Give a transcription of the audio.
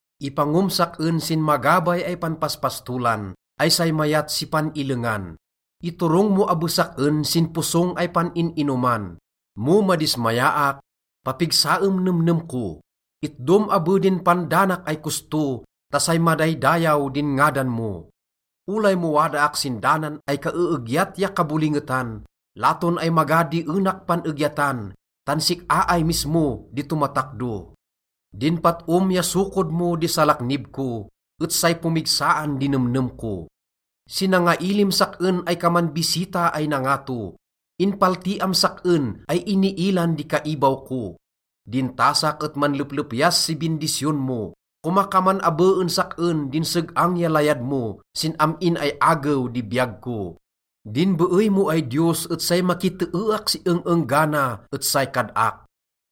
Ipangom sak-en sin magabay ay panpaspastolan ay say mayat si pan-illengan, iturong mo abes sak-en sin posong ay pan-in-inoman. Mo madismayaak, papigsaem nemnem ko. Itdom abe din pandanak ay kosto ta say madaydayaw din ngadan mo. Olay mo wadaak sin danan ay kaeegyat ya kabolingetan, laton ay maga di enak pan-egyatan tan sik-a ay mismo di tomatakdo. Din pat-om ya sokod mo di salaknib ko, et say pomigsaan di nemnem ko. Sinangailim sak-en ay kaman bisita ay nangato, inpaltiam sak-en ay iniilan di kaibaw ko. Din tasak et manleplepyas si bindisyon mo. Komakaman abe en sak-en din seg-ang ya layad mo sin am-in ay agew di biyag ko. Din beey mo ay Diyos et say makiteeak si eng-enggana et say kad-ak.